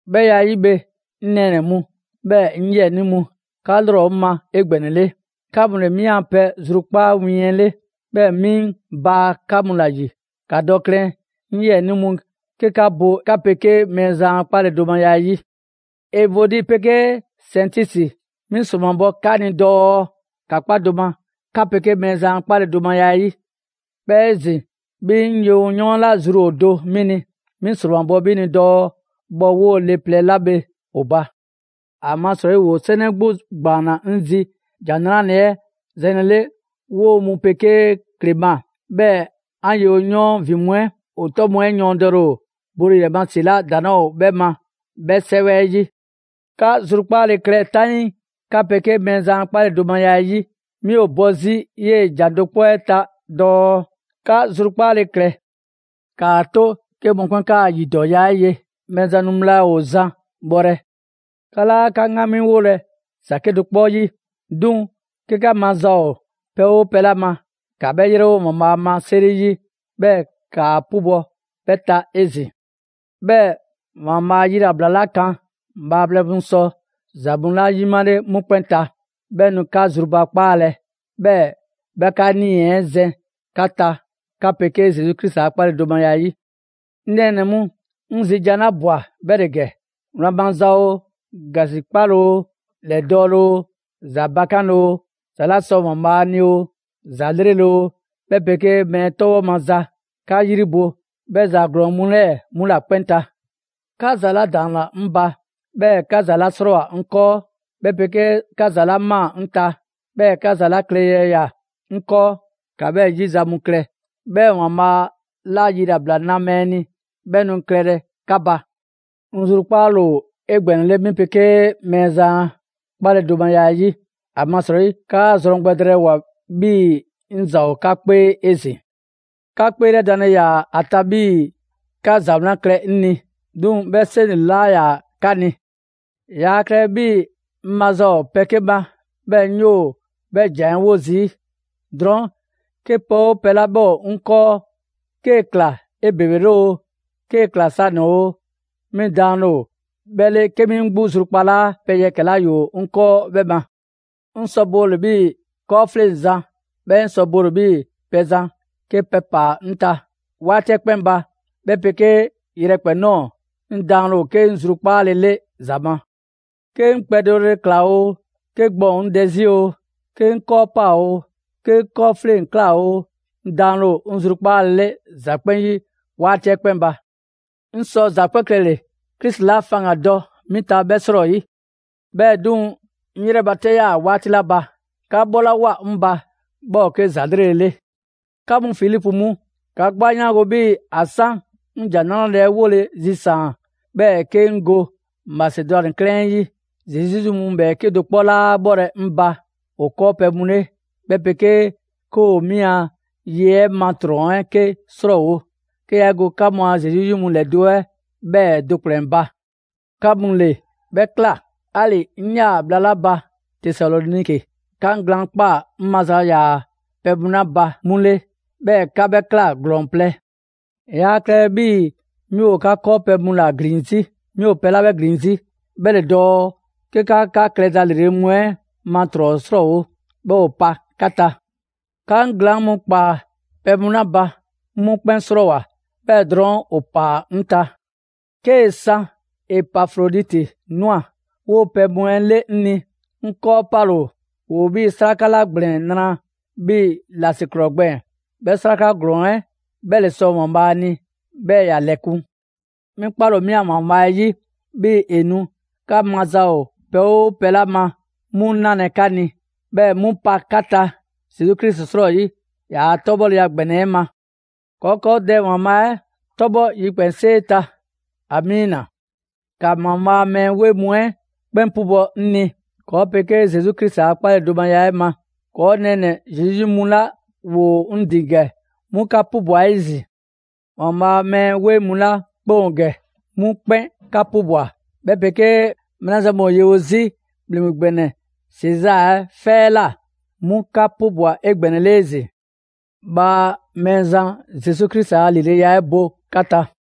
'Bhɛ ya 'ɛ 'yi bhe, 'ŋ nɛɛnɛ‑ mu, 'bhɛɛ‑ 'ŋ 'yiɛnii mu, 'ka 'lrɔ ‑o 'ŋ ma 'egbɛnɛle. 'Ka mu ‑le 'mi a pɛ zrukpaa' win 'ɛ 'le, 'bhɛɛ‑ 'mi 'ŋ baa 'ka mu ‑la ‑yi. ‑Ka dɔ klɛn, 'ŋ 'yiɛnii mu 'ke 'ka bo 'ka 'pegee Mɛɛzan a 'kpaledomaya 'ɛ 'yi. Evodi 'pegee Sɛntisi, 'mi ‑sromabɔ 'ka ni dɔɔ ‑ka 'kpa do ma, 'ka 'pegee Mɛɛzan a 'kpaledomaya 'ɛ 'yi. 'Bhɛɛ‑ 'ezin‑ 'bhi 'ŋ yewoyɔɔn 'la zru ‑o do 'mi ni, 'mi ‑sromabɔ 'bhi ni dɔɔ bhɔ 'woo‑ le plɛ 'la bhe ‑o ba. ‑Amasrɔyi ‑woo 'sɛnɛ 'gbu ‑gbaanna 'ŋ zi ‑Jan 'Nrale‑ 'ɛ zɛnlele, 'woo‑ mu 'pegee Klema, 'bhɛɛ‑ 'an yewo 'yɔɔn ‑vin mu 'ɛ. ‑O 'tɔ mu 'ɛ yɔɔndɛle ‑o bole ‑yrɛ ma ‑si 'la ‑daŋ' 'laa ‑o 'bhɛ ma 'bhɛ 'sɛwɛ 'yi. 'Ka zrukpaale klɛ 'taŋii 'ka 'pegee Mɛɛzan a 'kpaledomaya 'ɛ 'yi. 'Mi ‑o bɔ 'zi 'yee‑ ‑jan do 'kpɔ 'ɛ ta dɔɔ: 'Ka zrukpaale klɛ! ‑Kaa 'to 'ke mɔkpɛn' 'kaa‑ ‑yidɔɔya 'ɛ ye. Mɛɛzan nu bhla ‑o zan bhɔlɛ. 'Ka 'laa 'ka 'ŋgamiwolɛ ‑za 'kedo‑ 'kpɔ 'yi. 'Duŋ‑ 'ke 'ka maza ‑o pɛ 'oo pɛ 'la ma, ‑ka 'bhɛ 'yrɛwo ‑Waanbhaa' ma 'seri 'yi, 'bhɛɛ‑ 'kaa 'pubɔ‑ 'bhɛ ta 'ezin‑. 'Bhɛɛ‑ ‑Waanbhaa' a yilabla 'la kan bhaaplɛŋ mu sɔ ‑za mu 'la yimale 'mu 'kpɛn ta, 'bhɛ nu 'ka zrubakpaalɛ, 'bhɛɛ‑ 'bhɛ 'ka 'nii‑ zɛn 'ka ta 'ka 'pegee Zesu Krisi a 'kpaledomaya 'ɛ 'yi. 'Ŋ nɛɛnɛ‑ mu, 'ŋ zi jan 'la ꞊bwa 'bhɛ ‑le gɛ: Wlan maza oo, ‑gasikpale oo, ‑lɛdɔɔle oo, ‑za bakanle oo, ‑za 'la sɔ ‑Waanbhaa ni oo, ‑za 'lrele‑ oo, 'bhɛ 'pegee mɛɛ 'tɔbhɔ maza, 'ka 'yri bo 'bhɛ ‑za ‑glɔɔn mu 'lɛɛ‑ 'mu ‑la 'kpɛn ta. 'Ka ‑za 'la ‑daanna 'ŋ ba, 'bhɛɛ‑ 'ka ‑za 'la 'srɔɔwoa‑ 'ŋ 'kɔɔ, 'bhɛ 'pegee 'ka ‑za 'la ꞊maa 'ŋ ta, 'bhɛɛ‑ 'ka ‑za 'la klɛle ‑ya 'ŋ 'kɔɔ, ‑ka 'bhɛ 'yi za mu klɛ. 'Bhɛɛ‑ ‑Waanbhaa' 'la yilabla na mɛɛ ni, 'bhɛ nu klɛlɛ 'ka ba. 'Ŋ zrukpaale ‑o 'egbɛnɛle 'mi 'pegee Mɛɛzan a 'kpaledomaya 'ɛ 'yi; ‑amasrɔyi, 'kaa zrɔn gbɛ drɛɛwoa‑ 'bhii‑ 'ŋ ‑za ‑o 'ka 'kpee 'ezin‑. 'Ka 'kpeelɛdanle ‑yaa ‑a ta 'bhii‑ 'ka ‑za 'wlan klɛ 'ŋ ni. 'Duŋ‑ 'bhɛ 'seŋ ‑le 'laa ‑yaa 'ka ni. Yaa klɛlɛ 'bhii‑ 'ŋ maza ‑o pɛ 'ke ma 'bhɛɛ‑ 'ŋ 'yoo‑ 'bhɛ ‑jan 'ɛ 'wo zii'. Drɔɔn', 'ke pɛ 'oo pɛ 'la 'bhɛ ‑o 'ŋ 'kɔɔ, 'kee‑ ꞊kla 'ebebele oo, 'kee‑ ꞊kla sanɛ‑ oo, 'mi daanle ‑o 'bhɛ 'le 'ke 'mi 'ŋ zrukpalaa pɛ yɛkɛ‑ 'la ‑yoo 'ŋ 'kɔɔ 'bhɛ ma. 'Ŋ sɔ bole‑ 'bhii‑ 'kɔɔfleŋzan, 'bhɛɛ‑ 'ŋ sɔ bole bhii' pɛzan 'ke pɛ ‑paa 'ŋ ta. 'Waati 'ɛ 'kpɛn ba, 'bhɛ 'pegee yrɛ 'kpɛn nɔɔ‑, 'ŋ daanle ‑o 'ke 'ŋ zrukpaale 'le ‑za ma: 'Ke 'ŋ kpɛ dɔle ‑kla oo, 'ke gbɔn ‑o 'ŋ dɛ 'zi oo, 'ke 'ŋ 'kɔɔ 'paa‑ oo, 'ke 'ŋ 'kɔɔfleŋ‑ ‑kla oo, 'ŋ daanle ‑o 'ŋ zrukpaalele ‑za 'kpɛn 'yi 'waati 'kpɛn ba. 'Ŋ sɔ ‑za 'kpɛn klɛle‑, Krisi 'la faŋgandɔ 'mi ta 'bhɛ 'srɔyi. 'Bhɛɛ‑ 'duŋ‑, 'ŋ 'yrɛbatɛ 'yaa‑ 'waati 'la ba, 'ka 'bhɔlawoa 'ŋ ba, 'bhɛ ‑o 'ke ‑za 'lrele‑ 'le. 'Ka mu Filipu mu, 'ka 'gbu 'a 'yaango‑ 'bhii‑ ‑a 'san 'ŋ ‑Jan 'Nrale‑ 'ɛ 'wole‑ zisaan, 'bhɛɛ‑ 'ke 'ŋ go Masedwani ‑wa 'ɛ ta, Zesu 'yi mu ‑lɛ 'bhɛɛke do 'kpɔ 'laa 'bhɔlɛ‑ 'ŋ ba ‑o 'kɔɔpɛ‑ mu 'le, 'bhɛ 'pegee 'ke ‑o 'mi a ye 'ɛ ma ‑trɔn 'ɛ 'ke 'srɔɔwo‑, 'ke yaa 'e go 'ka mu a Zesu 'yi mu ‑lɛdo' 'ɛ 'bhɛɛ‑ do ‑kplɛn ba. 'Ka mu ‑le 'bhɛ ꞊kla. 'Ali‑ 'ŋ 'yaa‑ bhla 'la ba Tesaloniki 'ka 'ŋ glaan' ꞊kpaa 'ŋ maza ‑yaa pɛ mu 'la ba 'mu 'le, 'bhɛɛ‑ 'ka 'bhɛ ꞊kla ‑glɔɔn plɛ. Yaa klɛlɛ 'bhii‑ 'mi ‑o 'ka 'kɔɔpɛ‑ mu ‑la ‑glin 'zi. 'Mi ‑o pɛ 'la 'bhɛ zi 'bhɛ ‑le dɔɔ 'ke 'ka 'ka klɛza ‑lrele' mu 'ɛ ma ‑trɔn 'srɔɔwo‑, 'bhɛɛ‑ ‑o pa 'ka ta. 'Ka 'ŋ glaan' 'kpaa‑ pɛ mu 'la ba, 'ŋ 'mu 'kpɛn 'srɔɔwoa‑, 'bhɛɛ‑ drɔɔn', ‑o ‑paa 'ŋ ta. 'Kee‑ 'san Epafroditi ꞊nwa 'woo‑ pɛ mu 'ɛ 'le 'ŋ ni, 'ŋ 'kɔɔ 'pale‑ ‑o. ‑Woo 'bhii‑ 'sraka 'la ‑gblɛn nra 'bhii‑ ‑lasiklɔɔ gbɛɛn‑. 'Bhɛ 'sraka ‑glɔɔn 'ɛ 'bhɛ ‑le sɔ ‑Waanbhaa ni, 'bhɛɛ‑ ‑ya ‑lɛkun'. 'Mi 'kpale‑ ‑o 'mi a ‑Waanbhaa' 'yi, 'bhii ‑e nu 'ka maza ‑o pɛ 'oo pɛ 'la ma 'mu 'nalɛ‑ 'ka ni, 'bhɛɛ‑ e 'mu pa 'ka ta Zesu Krisi 'srɔyi, ‑yaa' 'tɔbhɔleya ‑gbɛnɛ 'ɛ ma. ‑Kɔɔ' ‑kɔɔ Dɛ ‑Waanbhaa' 'ɛ 'tɔbhɔ yikpɛnsee ta! Amiina! ‑Ka ‑Waanbhaa' a mɛɛ 'weŋ mu 'ɛ 'kpɛn 'pubɔ‑ 'ŋ ni ‑kɔɔ' 'pegee Zesu Krisi a 'kpaledomaya 'ɛ ma. ‑Kɔɔ' nɛɛnɛ‑ Zesu 'yi mu 'la ‑woo 'ŋ ‑din ‑gɛ 'mu 'ka 'pubwa‑ 'ezin‑. ‑Waanbhaa' a mɛɛ 'weŋ mu 'la 'kpɛn ‑o ‑gɛ, 'mu 'kpɛn 'ka 'pubwa‑; 'bhɛ 'pegee mɛɛ 'la zan mu ‑o yewo 'zi ‑Bhleŋgbe ‑gbɛnɛ Sezaa 'ɛ 'fɛ 'ɛ ꞊la, 'mu 'ka 'pubwa‑ 'egbɛnɛle 'ezin‑. Bhaa Mɛɛzan Zesu Krisi a ‑lileya 'ɛ bo 'ka ta.